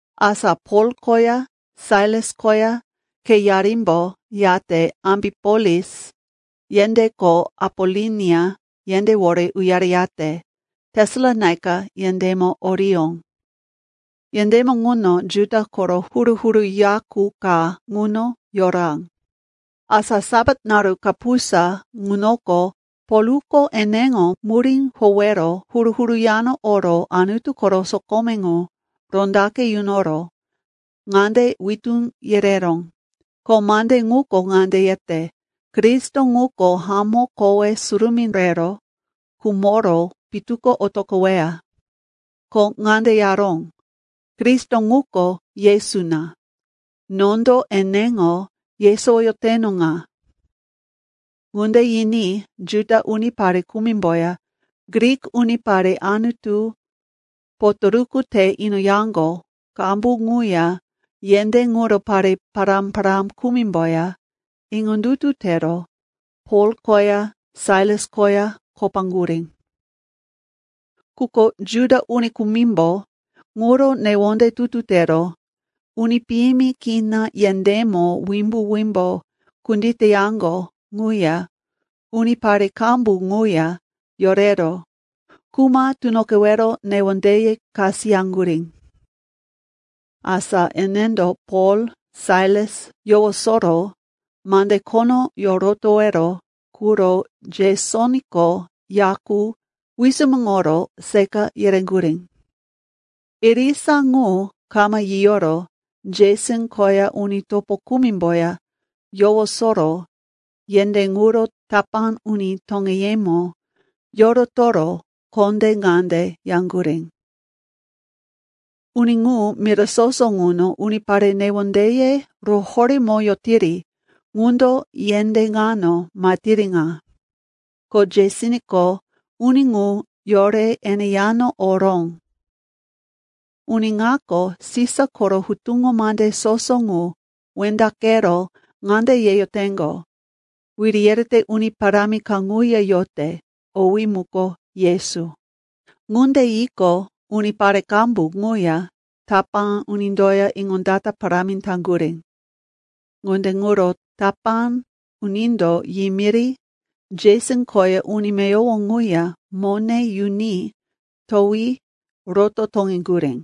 Asa Pol koya Sailas koya kheyarimbo yate Ambipolis yendé ko Apolonia yendéwore uyareyate Tesalonaika yendémo oriyó. Yendémo ŋuno Juda koro huru-huru ya qu ka ŋuno yora. Asa Sapat naru kapusa ŋunoko Polko eneŋo murí howero huru-huru yano oro Anutu koro sokome ŋu rondaqe yunoro ŋande witú yereró, ko mande ŋuko ŋande yete, Kristo ŋuko hamó kowe surumí rero khumoro pitu ko otoqoweya. Ko ŋande yaró, “Kristo ŋuko Yesu na, nondo eneŋo yesowoyoteno ŋa.” Ŋunde yiní Juda unipare kumimboya Grik unipare Anutu potoruku te inoyaŋgo qambu ŋuya yendé ŋuro pare pará-pará kumimboya iŋondutu tero Pol koya Sailas koya kopaŋgurí. Quko Juda uni kumimbo ŋuro newonde tutu tero uni piyimi kina yendémo wimbo-wimbo kunditeyaŋgo ŋuya unipare qambu ŋuya yorero kuma tunoqewero newondeye kasiyaŋgurí. Asa enendo Pol, Sailas yowosoro mande khono yorotowero quro Jesonko ya qu wisumuŋoro seqa yereŋgurí. Irisa ŋu kama yiyoro Jeson koya uni topo kumimboya yowosoro yendé ŋuro tapá uni toŋeyemo yorotoro kondé ŋande yaŋgurí, “Uni ŋu mira soso ŋuno unipare newondeye roworemoyotiri ŋundo yendé ŋano mahetiri ŋa. Ko Jesonko uni ŋu yore ene yano oró. Uni ŋako Sisa koro hutuŋo mande soso ŋu wendaqero ŋande yeyoteŋgo, wiri yerete uni parámi kaŋuya yote, owí muko Yesu.” Ŋunde yiqo, unipare qambu ŋuya tapá unindoya iŋondata parámi taŋgurí. Ŋunde ŋuro tapá unindo yimiri Jeson koya uni meyowo ŋuya mone yuni towi roto toŋeŋgurí.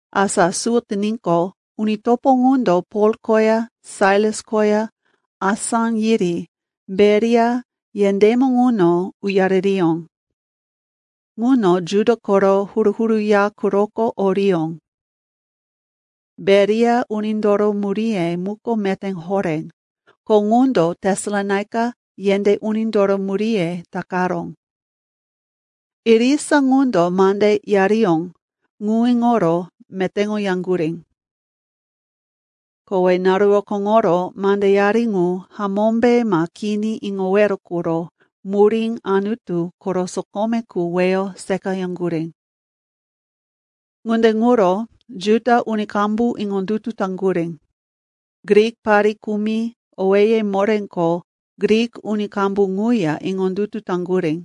Asa suwo tiníqo, uni topo ŋundo Pol koya Sailas koya asá yiri Beria yendémo ŋuno uyaririyó. Ŋuno Juda koro huru-huru ya quroko oriyó. Beria unindoro muríye muko meté horé, ko ŋundo Tesalonaika yendé unindoro muríye takaró. Irisa ŋundo mande yariyó ŋu iŋoro metéŋoyaŋgurí. Kowe naru rokóŋoro mandeyari ŋu hamómbe ma kini iŋowero quro murí Anutu koro sokome qu weyo seqayaŋgurí. Ŋunde ŋuro Juda uni qambu iŋondutu taŋgurí. Grik pare kumi owéye moré ko Grik uni qambu ŋuya iŋondutu taŋgurí.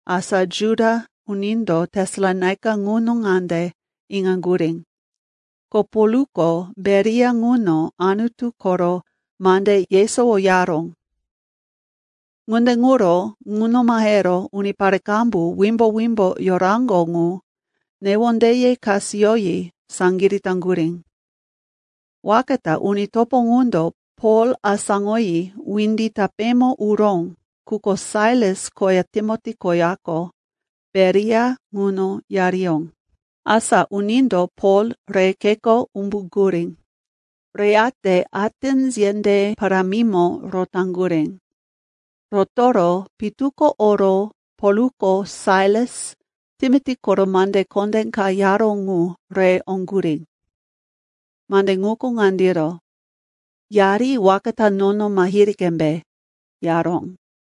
Asa Juda unindo Tesalonaika ŋuno ŋande iŋaŋgurí, ko Polko Beria ŋuno Anutu koro mande yesowoyaró. Ŋunde ŋuro ŋuno mahero unipare qambu wimbo-wimbo yoraŋgo ŋu newondeye kasiyoyi saŋgirí taŋgurí. Waka ta uni topo ŋundo Pol asáŋoyi windi tapémo uró, quko Sailas koya Timoti koyako Beria ŋuno yariyó. Asa unindo Pol re kheko umbuŋgurí, reyate Atens yendé parámimo rotaŋgurí. Rotoro pitu ko oro Polko Sailas, Timoti koro mande kondé ka yaró ŋu re oŋgurí. Mande ŋuko ŋandiro, “Yari waka ta nono mahiri qembe,” yaró.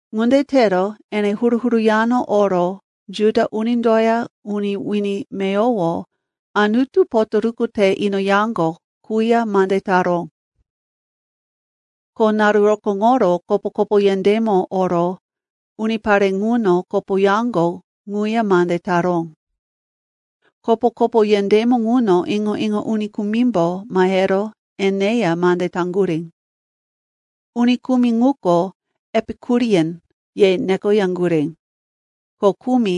Ŋunde tero ene huru-huru yano oro Juda unindoya uni wini meyowo Anutu potoruku te inoyaŋgo quya mande taró. Ko naru rokóŋoro kopo-kopo yendémo oro unipare ŋuno kopoyaŋgo ŋuya mande taró. Kopo-kopo yendémo ŋuno iŋo-iŋo uni kumimbo mahero eneya mande taŋgurí. Uni kumi ŋuko, “Epikurian,” ye nekoyaŋgurí, ko kumi,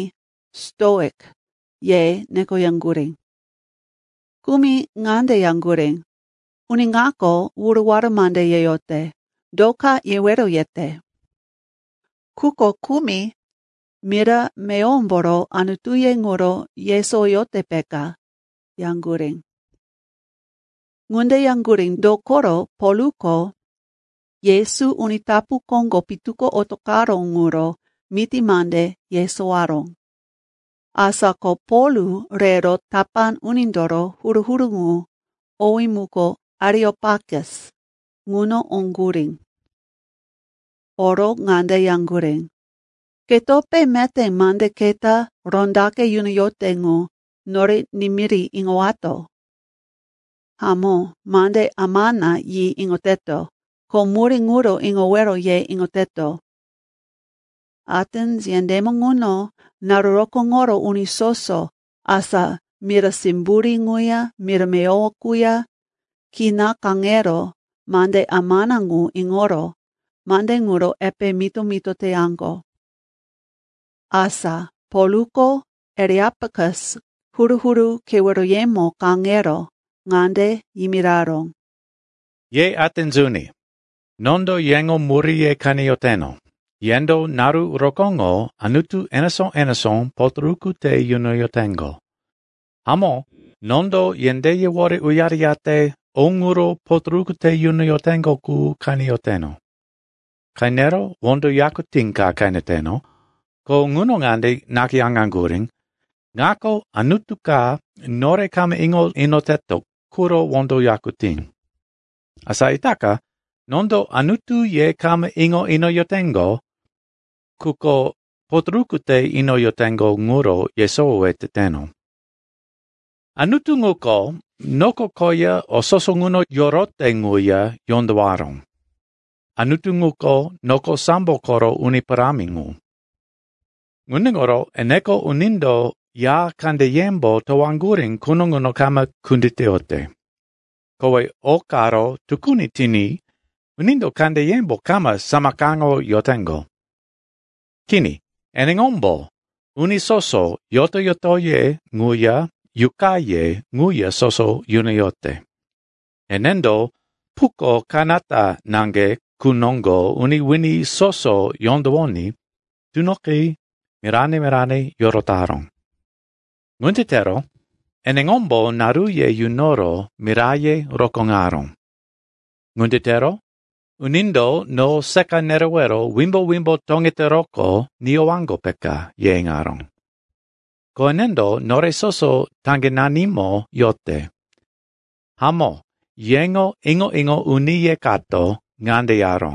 “Stoik,” ye nekoyaŋgurí. Kumi ŋande yaŋgurí, “Uni ŋako wuruwara mande yeyote. Do ka yewero yete?” Quko kumi, “Mira meyowomboro anutuye ŋuro yesowoyote, peka,” yaŋgurí. Ŋunde yaŋgurí, dokoro Polko Yesu uni tapu koŋgo pitu ko otoqaró ŋuro miti mande yesowaró. Asa ko Pol rero tapá unindoro huru-huru ŋu, owé muko Areopakus, ŋuno oŋgurí. Oro ŋande yaŋgurí, “Ketope meté mande keta rondaqe yunoyote ŋu nore nimiri iŋowato? Hamó, mande amana yi iŋoteto, ko murí ŋuro iŋowero ye iŋoteto.” (Atens yendémo ŋuno naru rokóŋoro uni soso, asa mira simburí ŋuya mira meyowo quya, kina kaŋero mande amana ŋu iŋoro mande ŋuro epe mito-mito teyaŋgo.) Asa Polko Areopakus huru-huru keweroyemo kaŋero ŋande yimiraró, “Ye Atens uni, nondo yeŋo muríye qeneyoteno, yendo naru rokóŋo anutu enesó-enesó potoruku te yunoyoteŋgo. Hamó, nondo yendéyewore uyareyate o ŋuro potoruku te yunoyoteŋgo qu qeneyoteno. Qenero wondo yakutí ka qeneteno, ko ŋuno ŋande nakayáŋgurí, ‘Ŋako anutu ka nore kama iŋo inoteto quro wondo yakutí.’ Asa itaka nondo Anutu ye kama iŋo inoyoteŋo, quko potoruku te inoyoteŋgo ŋuro yesowowe teteno. “Anutu ŋuko noko koya o soso ŋuno yorote ŋuya yondowaró, Anutu ŋuko noko sambo koro uni parámi ŋu. Ŋunde ŋuro eneko unindo ya kandeyembo towaŋgurí quno ŋuno kama kunditeyote. Kowe o karo tukuni tiní unindo kandeyembo kama samakaŋoyoteŋgo. Kini, eneŋombo uni soso yoto-yotoye ŋuya yuqaye ŋuya soso yunoyote. Enendo puko kanata naŋge qu noŋgo uni wini soso yondowoní tunoqi mirane-mirane yorotaró. Ŋunde tero eneŋombo naruye yunoro miraye rokóŋaró. Ŋunde tero, unindo no seqa nerewero wimbo-wimbo toŋeteroqo niyowaŋgo, peka, ye iŋaró. Ko enendo nore soso taŋgenanimo yote. Hamó, yeŋo iŋo-iŋo uniye kato ŋande yaró,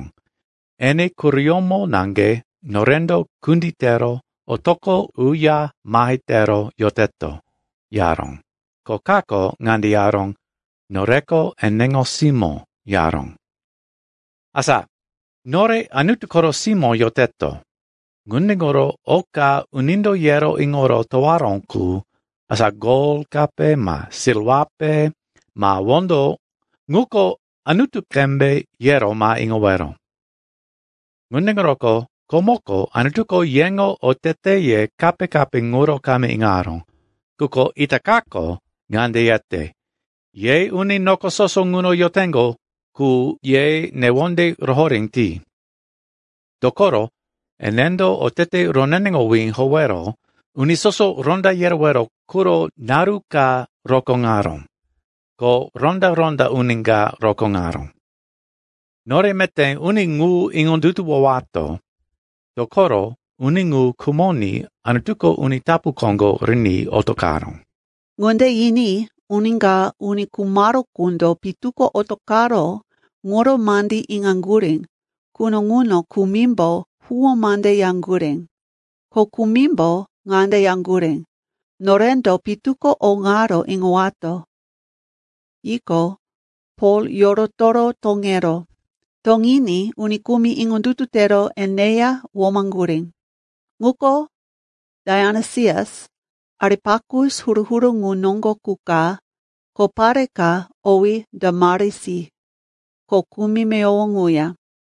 ‘Ene quroyómo naŋge norendo kunditero otoqo uya mahe tero yoteto,’ yaró, ko kako ŋande yaró, ‘Noreko eneŋo simó,’ yaró. “Asa, nore Anutu koro simó yoteto, ŋunde ŋuro oka unindo yero iŋoro towaró qu, asa gol kape ma silwape ma wondo ŋuko Anutu qembe yero ma iŋowero. Ŋunde ŋuroko komoko Anutuko yeŋo oteteye kape-kape ŋuro kama iŋaró, quko itakako ŋande yete, ye uni noko soso ŋuno yoteŋgo qu, ye newonde rohoré ti. Dokoro enendo otete roneneŋowí howero uni soso ronda yerewero quro naru ka rokóŋaró. Ko ronda-ronda uni ka rokóŋaró. Nore meté uni ŋu iŋondutuwowato, dokoro uni ŋu khumoní Anutuko uni tapu koŋgo riní otoqaró.” Ŋunde yiní uni ka uni khumaró qundo pitu ko otoqaró ŋuro mandí iŋaŋgurí quno ŋuno kumimbo huwó mande yaŋgurí. Ko kumimbo ŋande yaŋgurí, “Norendo pitu ko o ŋaro iŋowato.” Yiqo, Pol yorotoro toŋeró. Toŋiní uni kumi iŋondutu tero eneya womaŋgurí. Ŋuko Daionisias, Areopakus huru-huru ŋu noŋgo qu ka, ko pare ka, owí Damarisi, ko kumi meyowo ŋuya.